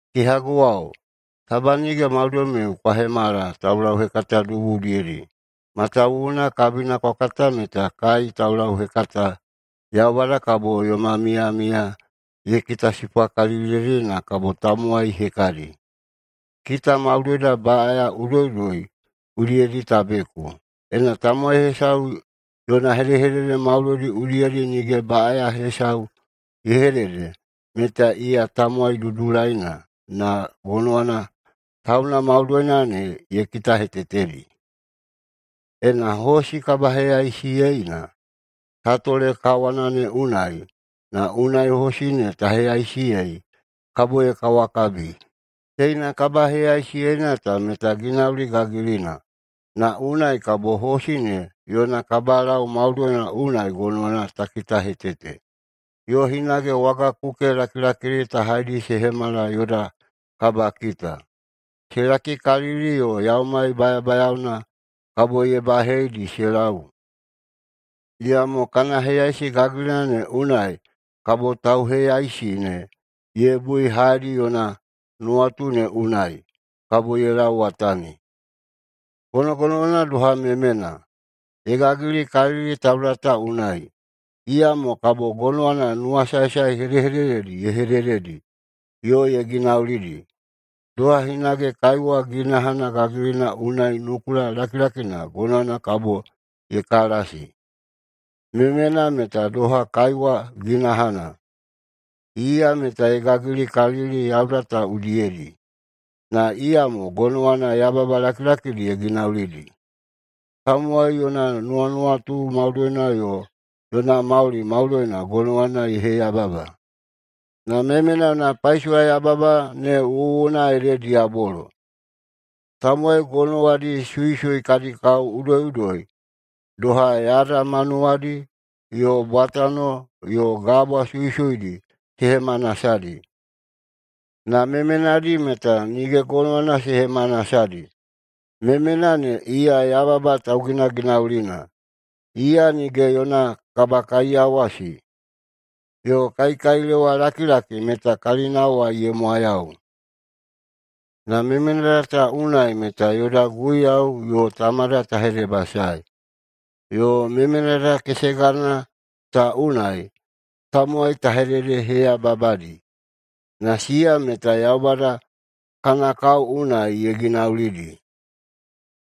Kehaguwao, taba nige maudoimiu kwa hemala taulauhekata dubu udiyedi. Matawuwuna kabina kwa kata meta kai taulauhekata Yaubada kabo yoma miyamiya ye kitasipwaikaliliyeidi na kabo tamowai hekadi. Kita maudoida baꞌaya udoiꞌudoi udiyedi ta beku. Ena tamowai hesau yona hedehedede maudoidi udiyedi nige baꞌaya hesau ye hedede meta iya tamowai dudulaina na gonowana tauna maudoina ne ye kitahetetedi. Ena hosi kabaheyaisiyeina ta tole kawana ne unai, na unai hosi ne ta heyaisiyei, kabo ye kawakabi. Teina kabaheyaisiyeina ta meta ginauli gagilina, na unai kabo hosi ne yona kabalau maudoina unai gonowana ta kitahetete. Yo hage, wagakuke lakilakidi ta haidi se hemala yoda kabakita. Se lakikalili yo yaumai bayabayaona kabo ye baheidi se lau. Iyamo kana heyaisi gagilina ne unai kabo tauheyaisi ne ye bui haedi yona nuwatu ne unai, kabo ye lauwatani. Gonogonowana doha memena. Ye gagilikalili tauda ta unai, iyamo kabo gonowana nuwasaesae hedehedededi ye hedededi yo ye ginaulidi. Doha hinage kaiwa ginahana gagilina unai nukula lakilakina gonowana kabo ye kalasi. Memena ne meta doha kaiwa ginahana. Iya meta ye gagilikalili yauda ta udiyedi, na iyamo gonowana yababa lakilakidi ye ginaulidi. Tamowai yona nuwanuwatu maudoina yo yona mauli maudoina gonowana ye heyababadi, na memena yona paisowayababa ne wuwuna ede diyabolo. Tamowai gonowadi suisui kadi kao udoiꞌudoi, doha yada manuwadi, yo bwatano yo gabwa suisuidi se hemanasadi, na memenadi meta nige gonowana se hemanasadi. Memena ne iya yababa tauginaginaulina, iya nige yona kabakaiyawasi, yo kaikailewalakilaki meta kalinawai ye mwayau. Na memenada ta unai meta yoda Guiyau yo Tamada ta hedebasae, yo memenada kesegana ta unai tamowai ta hededeheyababadi. Na siya meta Yaubada kana kao unai ye ginaulidi.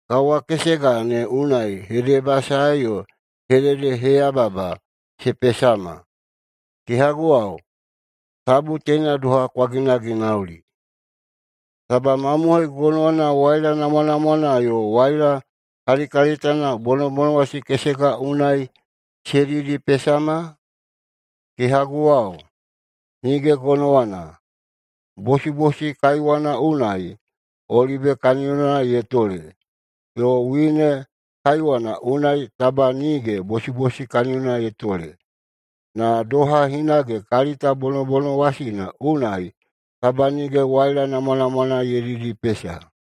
Kawa kesega ne unai hedebasae yo hededeheyababa se pesama. Kehaguwao, tabu teina doha kwa ginaginauli! Taba mamohoi gonowana waila namwanamwana yo waila kalikalitana bonobonowasi kesega unai se didipesama? Kehaguwao, nige gonowana bosibosi kaiwana unai olibe kaniyona ye tole, yo wine kaiwana unai taba nige bosibosi kaniyona ye tole. Na doha hinage kalita bonobonowasina unai taba nige waila namwanamwana ye didipesa.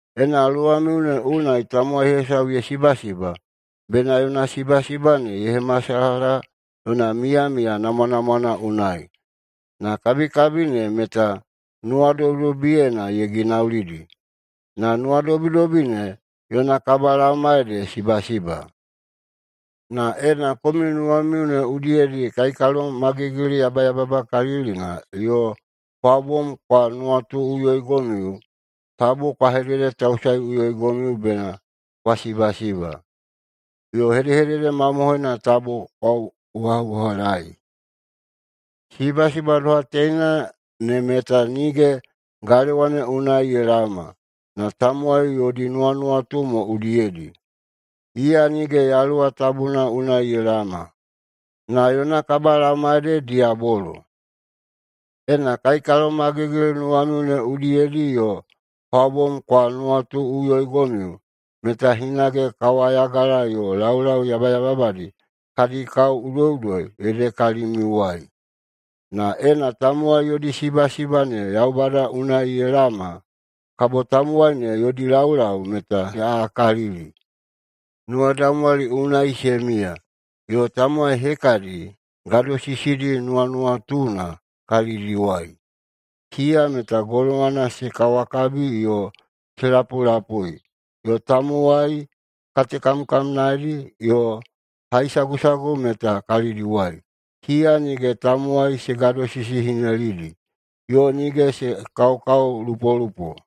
Ena luwamiu ne unai tamowai hesau ye sibasiba, bena yona sibasiba ne ye hemasalaha yona miyamiya namwanamwana unai, na kabikabi ne meta nuwadobidobiyena ye ginaulidi. Na nuwadobidobi ne yona kabalaoma ede sibasiba. Na ena komiu nuwamiu ne udiyedi kaikalomagigili yabayababakalilina yo kwa bom kwa nuwatuꞌuyoigomiu, tabu kwa hededetausaeꞌuyoigomiu bena kwa sibasiba, yo hedehedede mamohoina tabu kwa uhaꞌuhalaei. Sibasiba doha teina ne meta nige galewa ne unai ye laoma, na tamowai yodi nuwanuwatu mo udiyedi. Iya nige Yaluwa Tabuna unai ye laoma, na yona kabalaoma ede diyabolo. Ena kaikalomagigili nuwamiu ne udiyedi yo kwa bom kwa nuwatuꞌuyoigomiu, meta hinage kawayagala yo laulau yabayababadi kadi kao udoiꞌudoi ede kalimiuwai. Na ena tamowai yodi sibasiba ne Yaubada unai ye laoma, kabo tamowai ne yodi laulau meta se aꞌakalili. Nuwadaumwali unai se miya, yo tamowai hekadi gadosisidi nuwanuwatuna kalidiwai. Siya meta gonowana se kawakabi yo se lapulapui, yo tamowai katekamkamnaedi yo haisagusagu meta kalidiwai. Siya nige tamowai se gadosisihinelidi, yo nige se kaokaolupolupo.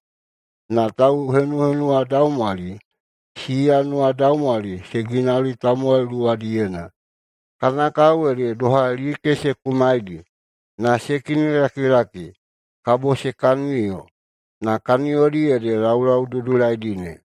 Na tauhenuhenuwadaumwali, siya nuwadaumwali se ginauli tamowai luwadiyena. Kana kao ede doha like se kumaidi, na se kinilakilaki, kabo se kaniyo. Na kaniyodi ede laulau dudulaidi ne.